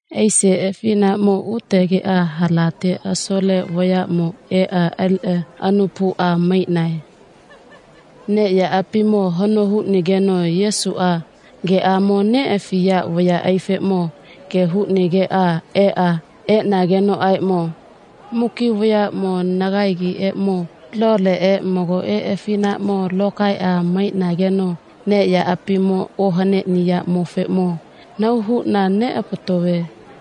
Aise afinaʼmo utegeʼa halate asole vayaʼmo eʼa aliʼa anupa huʼa maiʼnae. Neʼyaʼapimo hano huʼnigeno Yesuʼa geʼamo neʼafiya vayaʼaifeʼmo ge huʼnigeʼa eʼnagenoʼaeʼmo, muki vayaʼmo nagaegiʼeʼmo loleʼe magoʼe afinaʼmo lokaeʼa maiʼnageno neʼyaʼapimo ohaneʼniyaʼmofeʼmo nahau huʼna neʼapatove.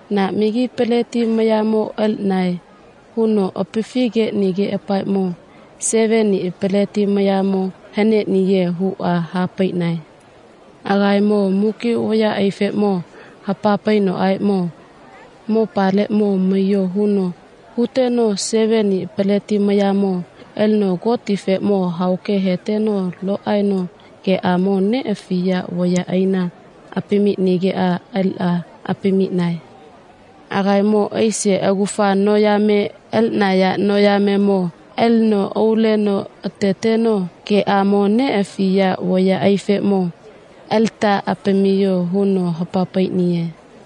na magi peleti mayamo aliʼnae, huno apafi geʼnigeʼapaeʼmo, seveniʼa peleti mayamo haneʼniye, huʼa ha paiʼnae. Agaemo muki vayaʼaifeʼmo hapa painoʼaeʼmo, mopaleʼmo maiyo, huno huteno seveniʼa peleti mayamo alino Gotifeʼmo hao ke heteno lo aeno geʼamo neʼafiya vayaʼaina apamiʼnigeʼa aliʼa apamiʼnae. Agaemo aise agufa noyame aliʼnaya noyamemo aliʼneno alino auleno ateteno geʼamo neʼafiya vayaʼaifeʼmo, alita apamiyo, huno hapa paiʼniye.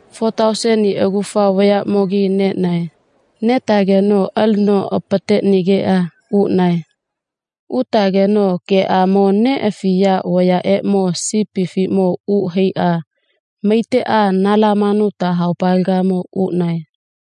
Fo tauseniʼa agufa vayaʼmogimo neʼnae. Netageno alino apateʼnigeʼa uʼnae. Utageno geʼamo neʼafiya vayaʼeʼmo sipifiʼmo uʼa haiʼa maiteʼa Nalamanuta haopalegamo uʼnae.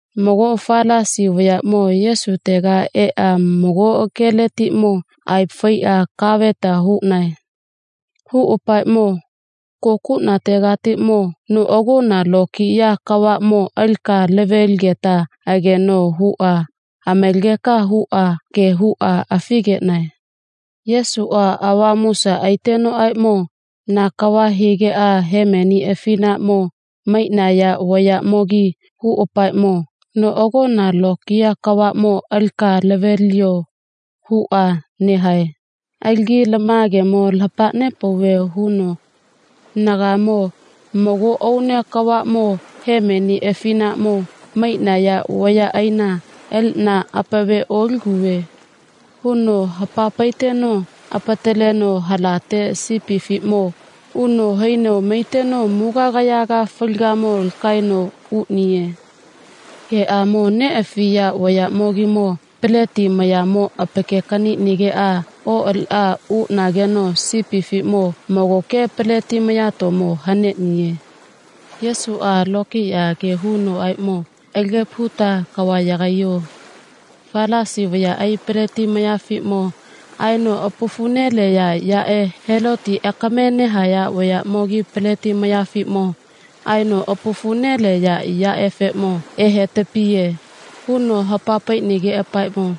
Mago Falasi vayaʼmo Yesutega eʼa mago geletiʼmo aepa faiʼa kaveta huʼnae. Huʼapaeʼmo, kokuʼnategatiʼmo noʼagona lokiya kavaʼmo alika lave ligeta ageno, huʼa amalageka huʼa ge huʼa afigeʼnae. Yesuʼa avamusa aitenoʼaeʼmo, na kava higeʼa hemeni afinaʼmo maiʼnaya vayaʼmogi huʼapaeʼmo noʼagona lokiya kavaʼmo alika lave liyo, huʼa nehae. Alagi lama gemo lapa nepauve, huno, nagaemo mago aune kavaʼmo hemeni afinaʼmo maiʼnaya vayaʼaina aliʼna apave oliguve, huno hapa paiteno apataleno halate sipifiʼmo uno haino maiteno mugagayaga faligamo lakaeno uʼniye. Geʼamo neʼafiya vayaʼmogimo peleti mayaeʼmo apake kaniʼnigeʼa oʼaliʼa uʼnageno sipifiʼmo magoke peleti mayatomo haneʼniye. Yesuʼa lokiya ge hunoʼaeʼmo, alagepa huta kava yagaiyo. Falasi vayaʼai peleti mayafiʼmo aeno apafu neleya yaʼe Heloti akame vayaʼamogi peleti mayafiʼmo aeno apafu neleya yaʼefeʼmo ehetapiye, huno hapa paiʼnigeʼapaeʼmo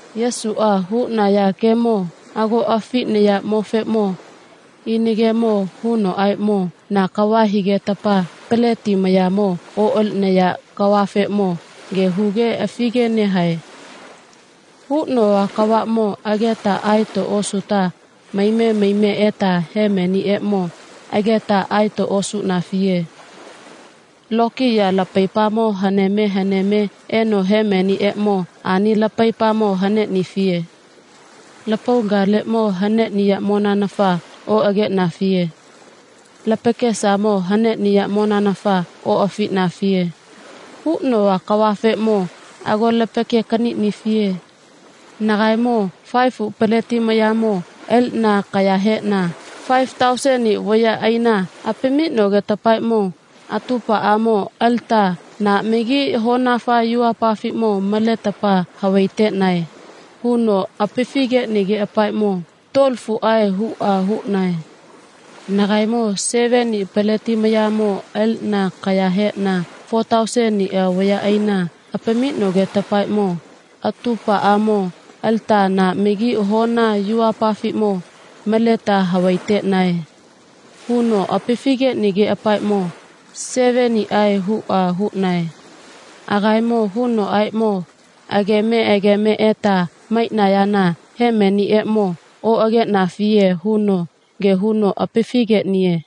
Yesuʼa huʼnaya gemo ago afiʼniyaʼmofeʼmo ina gemo hunoʼaeʼmo, na kava higetapa peleti mayamo oʼaliʼnaya kavafeʼmo ge huge afige nehae. Huʼnova kavaʼmo ageta aeto osuta maime maime eta hemeniʼeʼmo ageta aeto osuʼnafiye. Lokiya lapaipamo haneme haneme eno hemeniʼeʼmo ani lapaipamo haneʼnifiye. Lapaulagamo haneʼniyaʼmonanafa oʼageʼnafiye. Lapakesamo haneʼniyaʼmonanafa oʼafiʼnafiye. Huʼnova kavafeʼmo ago lapake kaniʼnifiye. Nagaemo faefuʼa peleti mayamo aliʼna akaya heʼna faefu tauseniʼa vayaʼaina apamiʼnogetapaeʼmo atupaʼamo alita na magi hona yuvapafiʼmo maletapa havai teʼnae, huno apafi geʼnigeʼapaeʼmo, tuolofuʼae, huʼa huʼnae. Nagaemo seveniʼa peleti mayamo aliʼna akaya heʼna fo tauseniʼa vayaʼaina apamiʼnogetapaeʼmo atupaʼamo alita na magi hona yuvapafiʼmo maleta havai teʼnae, huno apafi geʼnigeʼapaeʼmo, seveniʼae, huʼa huʼnae. Agaemo hunoʼaeʼmo, ageme ageme eta maiʼnayana hemeniʼeʼmo oʼageʼnafiye, huno ge huno apafi geʼniye.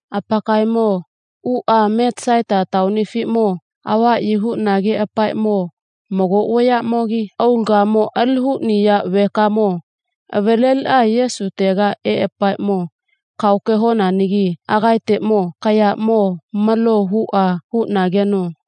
Apakaemo uʼa Metasaita taonifiʼmo avaʼyi huʼnageʼapaeʼmo mago vayaʼmogi aulagamo ali huʼniya vekamo avaleliʼa Yesutega eʼapaeʼmo, kahao ke honanagi agaeteʼmo kayaʼmo malo, huʼa huʼnageno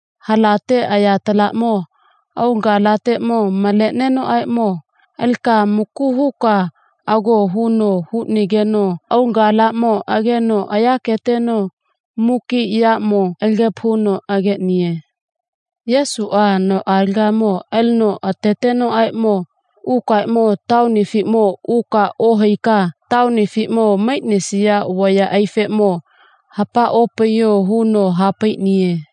halate ayatalaʼmo aulagalateʼmo maleʼnenoʼaeʼmo, alika maku huka ago, huno huʼnigeno aulagalaʼmo ageno yaketeno muki yaʼmo alagepa huno ageʼniye. Yesuʼa noʼalega alino atetenoʼaeʼmo, ukaeʼmo taonifiʼmo uka ohaika taonifiʼmo maiʼnisaya vayaʼaifeʼmo hapa opaiyo, huno ha paiʼniye.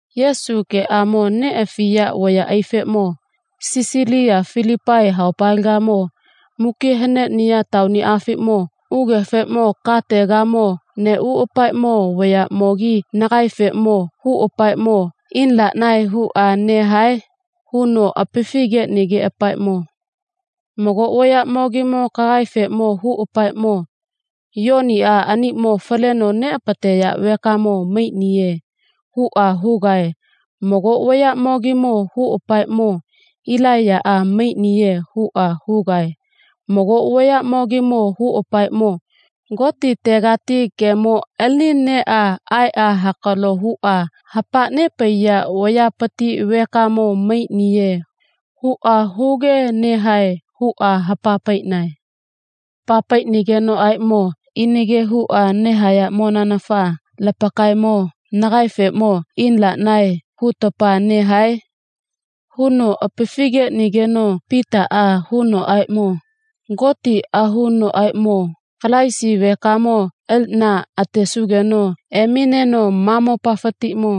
Yesuʼe geʼamo neʼafiya vayaʼeʼmo Sisaliya Filipai haopalegamo muki haneʼniya taoniʼafiʼmo ugefeʼmo kategamo neʼuʼapaeʼmo, vayaʼmogimo nagaefeʼmo huʼapaeʼmo, ina laʼnae, huʼa nehae, huno apafi geʼnigeʼapaeʼmo, Mago vayaʼamogi kagaefeʼmo huʼapaeʼmo, Yoniʼa aniʼmo faleno neʼapateya vekamo maiʼniye, huʼa huge mago vayaʼamogi huʼapaeʼmo, Ilaiyaʼa maiʼniye, huʼa huge mago vayaʼamogi huʼapaeʼmo, Gotitegati gemo alini eʼa aeʼa hakalo huʼa hapa nepaiya vayapati vekamo maiʼniye, huʼa huge nehae, huʼa ha paiʼnae. Ha paiʼnagenoʼaeʼmo, Ina ge huʼa nehayaʼmonanafa lapakaemo nagaefeʼmo ina laʼnae, hutapa nehae, huno apafi geʼnigeno Pitaʼa hunoʼaeʼmo, Gotiʼahunoʼaeʼmo, Kalaisi vekamo aliʼna atesugeno emineno ma mopafatiʼmo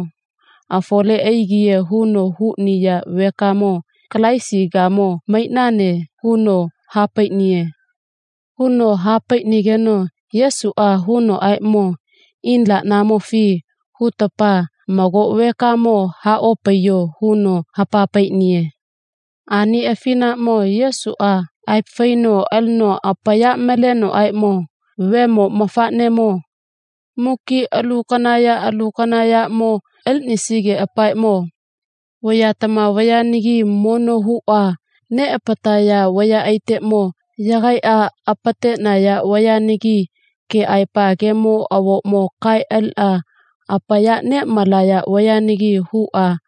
afole aigiye, huno huʼniya vekamo Kalaisigamo maiʼnane, huno ha paiʼniye. Huno ha paiʼnigeno Yesuʼa hunoʼaeʼmo, ina laʼnamofi hutapa mago vekaeʼmo ha opaiyo, huno hapa paiʼniye. Ani afinaʼmo Yesuʼa aepa faino alino apaya malenoʼaeʼmo, Vemo mafaʼnemoʼmo muki alu kana ya alu kana yaʼmo aliʼnisigeʼapaeʼmo vayatama vayanagi mono huʼa neʼapataya vayaʼaiteʼmo yagaiʼa apateʼnaya vayanagi keʼaepa gemo avoʼmo kaeʼa aliʼa apaya neʼmalaya vayanagi huʼa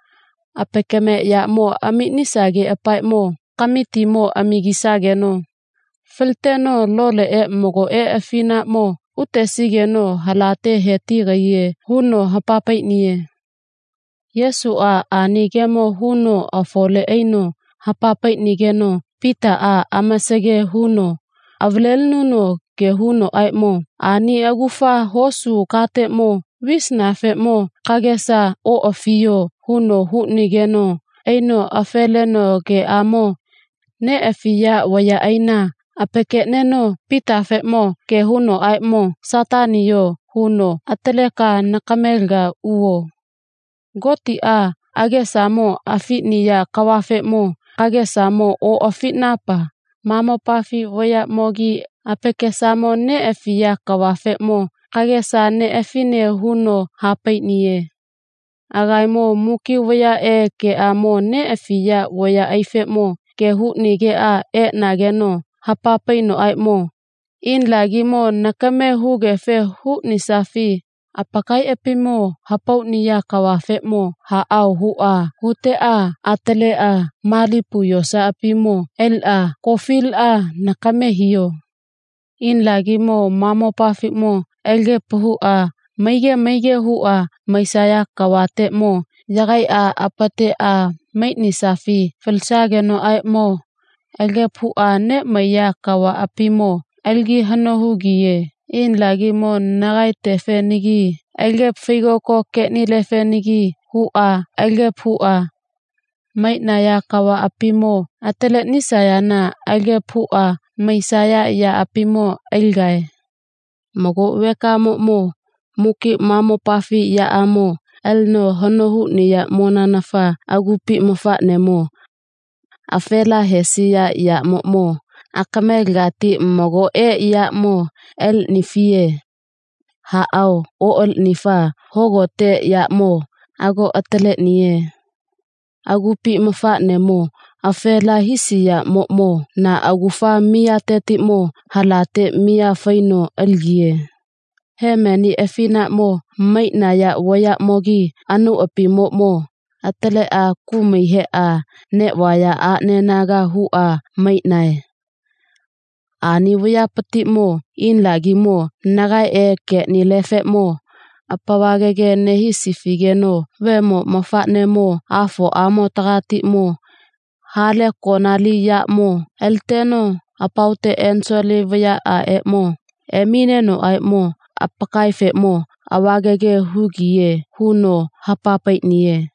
apakameʼyamo amiʼnisageʼapaeʼmo kamitimo amagisageno faliteno loleʼe magoʼe afinaʼmo utesigeno halate he tigiye, huno hapa paiʼniye. Yesuʼa ani gemo huno afole aino hapa paiʼnigeno Pitaʼa amasage huno avalelinuno ge haunoʼaeʼmo, ani agufa hosu kateʼmo visanafeʼmo kagesa oʼafiyo, huno huʼnigeno aino afe leno geʼamo neʼafiya vayaʼaina apakeʼneno Pitafeʼmo ge haunoʼaeʼmo, Sataniyo, huno, atalekeka nakamelegamo uvo. Gotiʼa agesamo afiʼniya kavafeʼmo kagesamo oʼafiʼnapa ma mopafi vayaʼmogi apakesamo neʼafiya kavafeʼmo kagesa neʼafine, huno ha paiʼniye. Agaemo muki vayaʼe geʼamo neʼafiya vayaʼefeʼmo ge huʼnigeʼa eʼnageno hapa painoʼaeʼmo, ina lagimo nakame hugefe huʼnisafi apakaiʼapimo hapauʼniya kavafeʼmo haʼao, huʼa huteʼa ataleʼa malipu yosaʼapimo aliʼa kofiliʼa nakame hiyo. Ina lagimo ma mopafiʼmo alagepa huʼa maige maige huʼa maisaya kavateʼmo yagaiʼa apateʼa maiʼnisafi falisagenoʼaeʼmo alagepa huʼa neʼmaiya kavaʼapimo alagi hano hugiye. Ina lagimo nagaetefenagi alagepa faigoko geʼnilefenagi huʼa alagepa huʼa maiʼnaya kavaʼapimo ataleʼnisayana alagepa huʼa maisaya yaʼapimo aligae. Mago vekamoʼmo muki ma mopafi yaʼamo alino hano huʼniyaʼmonanafa agupi mafaʼnemo afela hesiyaʼmoʼmo akamelegati magoʼe yaʼmo aliʼnifiye. Haʼao, oʼaliʼnifa hogote yaʼmo ago ataleʼniye. Agupi mafaʼnemo afela hisiyaʼmoʼmo na agufa miyatetiʼmo halate miya faino aligiye. Hemeni afinaʼmo maiʼnaya vayaʼmogi anauʼapimoʼmo ataleʼa kumai heʼa neʼvaya aʼnegana huʼa maiʼnae. Ani vayapatiʼmo ina lagimo nagaeʼe geʼnileʼefeʼmo apavagage nehisifigeno Vemo mafaʼnemoʼmo Afoʼamotegatiʼmo ha le konali yaʼamo aliteno apaote enisole vayaʼaʼeʼmo eminenoʼaeʼmo apakaefeʼmo avagage hugiye, huno hapa paiʼniye.